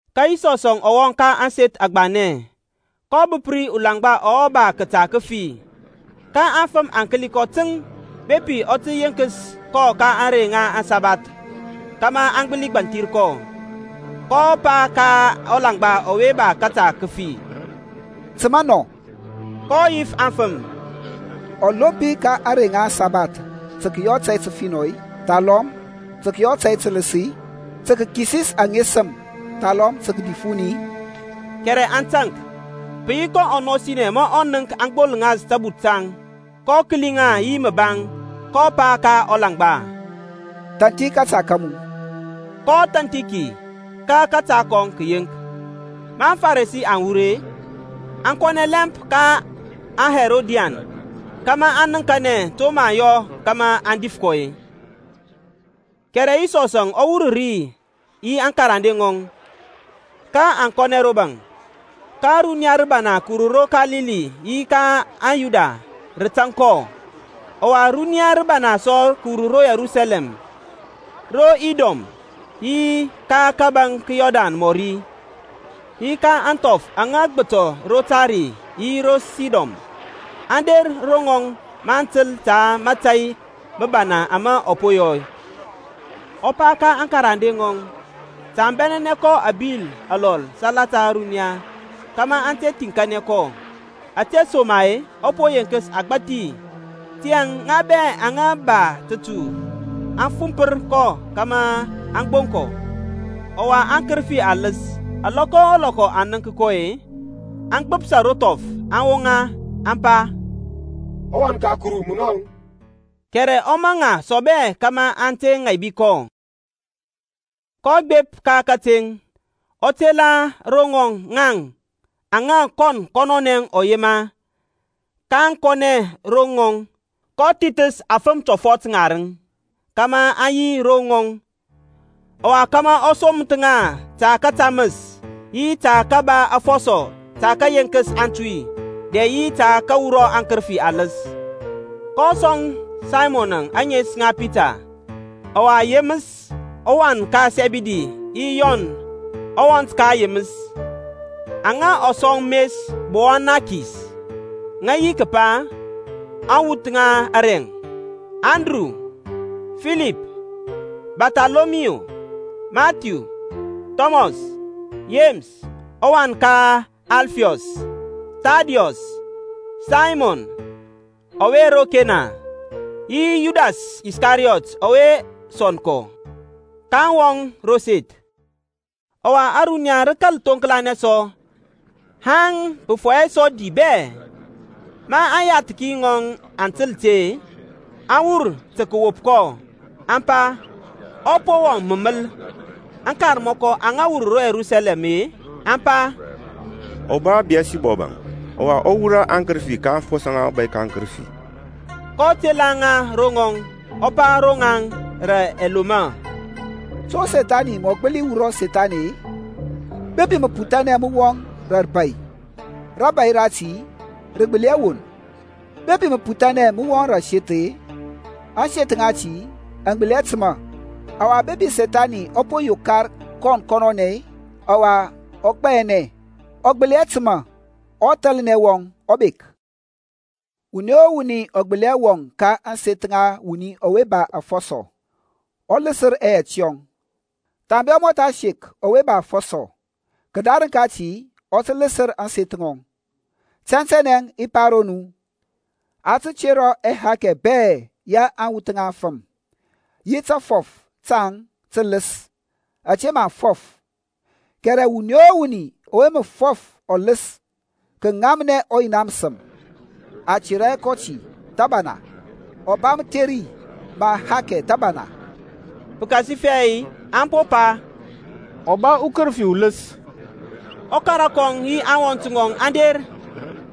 Ka Yisɔsȧŋ ɔ wɔŋ sɔ ka ȧŋseth agbanɛ, kɔ bəp ri ulaŋgba ɔwe ba kəta kəfi. Ka aŋfəm aŋ kəli kɔ təŋ, bepi ɔ tə yenkəs kɔ ka ȧŋrey ŋa aŋsabath, kȧmȧ aŋ gbəli gbȧnthir kɔ. kɔ pa ka ɔlaŋgba ɔwe ba kȧta kəfi, Təmȧ nɔ. kɔ yif aŋfəm, Ɔlompi ka ȧŋrey ŋa aŋsabath tə kəyɔ tȧy təfinɔ-i, thalɔm tə kəyɔ tȧy tələs-i? Tə kəkisis ŋesəm-i thalɔm tə kədif wuni-i? Kɛrɛ aŋ taŋk. Pə yi kɔ ɔnɔsinɛ ma ɔ nənk aŋ gbolŋas tabuth taŋ, kɔ kəli ŋa yi məbaŋ, kɔ pa ka ɔlaŋgba, Thanthi kȧta ka mu. Kɔ thanthi ki ka kȧta kɔŋ kə yeŋk. Ma aŋFarisi aŋ wur-e, aŋ kɔnɛ lɛmp ka aŋHerodian kȧmȧ aŋ nəŋkanɛ to mə aŋ yɔ kȧmȧ aŋ dif kɔ. Kɛrɛ Yisɔs ɔ wur ri yi aŋkarande ŋɔŋ, ka aŋ kɔnɛ ro baŋ. Ka runiya rəbana kəwur ro Kalili yi ka Yudia rə tȧŋ kɔ. Ɔwa runiya rəbana sɔ kəwur ro Yerusalɛm, ro Idɔm yi ka kȧbȧŋ ka Yɔrdan mɔri, yi ka ȧŋthɔf aŋa gbətɔ ro Tair yi ro Sidon, aŋ der ro ŋɔŋ maŋ təl ta mȧtȧy məbana ama ɔ po yɔ. Ɔ pa ka aŋkarande ŋɔŋ, ta aŋ bɛnɛnɛ kɔ abil alɔl salata ȧruniya, kȧmȧ aŋ te thiŋkanɛ kɔ, ȧtesoma-e ɔ po yenkəs agbȧthi. Tiyȧŋ ŋa bɛ aŋa ba tətu aŋ fumpər kɔ kȧmȧ aŋ gboŋ kɔ. Ɔwa aŋkərəfi aləs, alɔkɔ o lɔkɔ aŋ nənk kɔ-e, aŋ gbapsa ro thɔf, aŋ woŋa, aŋ pa, ƆWan ka Kuru munɔŋ. Kɛrɛ ɔ maŋ ŋa asɔbɛ kȧmȧ aŋ te ŋaibi kɔ. kɔ gbep ka kateŋ, ɔ tela ro ŋɔŋ aŋa kɔn kɔnɔnɛ ɔ yema, kaŋ kɔnɛ ro ŋɔŋ. kɔ thithəs afəm tɔfɔt ŋarəŋ kȧmȧ aŋ yi ro ŋɔŋ, ɔwa kȧmȧ ɔ soməth ŋa tə kətaməs, yi tə kəba afɔsɔ tə kəyeŋkəs aŋtuy, dɛ yi tə kəwura akərəfi aləs. kɔ sɔŋ Saymɔn ȧŋes ŋa Pita; ɔwa Yeməs ɔwan ka Sɛbidi yi Yɔn ɔwɔnt ka Yeməs, aŋa ɔ sɔŋ mes Bowanakes, ŋə yi kəpa, aŋwuth ŋa arɛŋ. Andru, Filip, Barthɔlɔmiyu, Mathiu, Thɔmɔs, Yeməs ɔwan ka Alfiyɔs, Thadiyus, Saymɔn ɔwe ro Kena, yi Yudas Iskariyɔt ɔwe sɔnd kɔ. kaŋ wɔŋ rȧ ȧseth. Ɔwa ȧruniya rə kȧl thoŋklanɛ sɔ, haŋ pə fɔyɛ sɔ di bɛ. Ma aŋyathki ŋɔŋ aŋ təl ti-e, aŋ wur tə kəwop kɔ, aŋ pa, Ɔ po wɔŋ məməl. Aŋkarmɔkɔ aŋa wur ro Yerusalɛm-e, aŋ pa, Ɔ ba Biyɛlsibɔb, ɔwa ɔ wurɔ aŋkərəfi ka aŋfɔsɔ ŋa ɔbȧy ka aŋkərəfi. kɔ tela ŋa ro ŋɔŋ, ɔ pa ro ŋaŋ rȧ ɛlomɔ, To Sethani mɔ gbəli wurɔ Sethani-e? Bepi məputhanɛ mə wɔŋ rȧ rəbȧy, rȧbȧy rati rə gbəli hɛ won. Bepi məputhanɛ mə wɔŋ rȧ ȧseth-e, ȧŋseth ŋati aŋ gbəli hɛ təmȧ. Ɔwa bepi Sethani ɔ po yokar kɔn kɔnɔnɛ, ɔwa ɔ gbayanɛ, ɔ gbəli hɛ təmȧ, ɔthalnɛ wɔŋ ɔ bek. Wuni o wuni ɔ gbəli hɛ wɔŋ ka ȧŋseth ŋa wuni ɔwe ba afɔsɔ, ɔ ləsər ɛyɛt yɔŋ, thambe ɔ mɔtha sek ɔwe ba aŋfɔsɔ. Kədarəŋ kati ɔ tə ləsər ȧŋseth ŋɔŋ. Tɛntɛnɛ i pa ro nu, A tə tera ɛhakɛ bɛ ya aŋwuth ŋa aŋfəm, yi tȧfɔf taŋ tələs ȧte maŋ fɔf, kɛrɛ wuni o wuni ɔwe mə fɔf ɔləs kəŋamnɛ ɔ Yina məsəm a tera hɛ kɔ ti thȧbana, ɔ ba mətheri ma ahakɛ thəbana. Pəkasifɛ aŋ po pa, Ɔ ba ukərəfi uləs. Ɔkara kɔŋ yi aŋwɔnt ŋɔŋ aŋ der,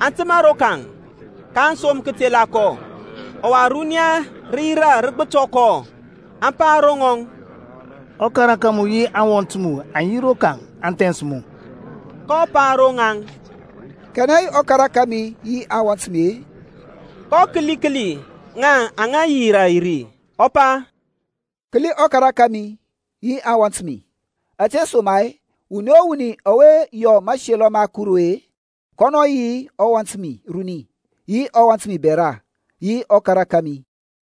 aŋ təmȧ rokaŋ, kaŋ som kətela kɔ. Ɔwa runiya rə yirȧ rə gbətɔ kɔ, aŋ pa ro ŋɔŋ, Ɔkara ka mu yi aŋwɔnt mu aŋ yi rokaŋ aŋ thɛns mu. kɔ pa ro ŋaŋ, Kanɛ yi ɔkara kȧmi yi aŋwɔnt mi-e? kɔ kəli kəli ŋa aŋa yirȧ ri, ɔ pa, Kəli ɔkara kȧmi yi aŋwɔnt mi! Ȧtesoma-e wuni o wuni ɔwe mə yɔ mȧselɔ ma Kuru-e kɔnɔ yi ɔwɔnt mi runi, yi ɔwɔnt mi bɛra, yi ɔkara kȧmi.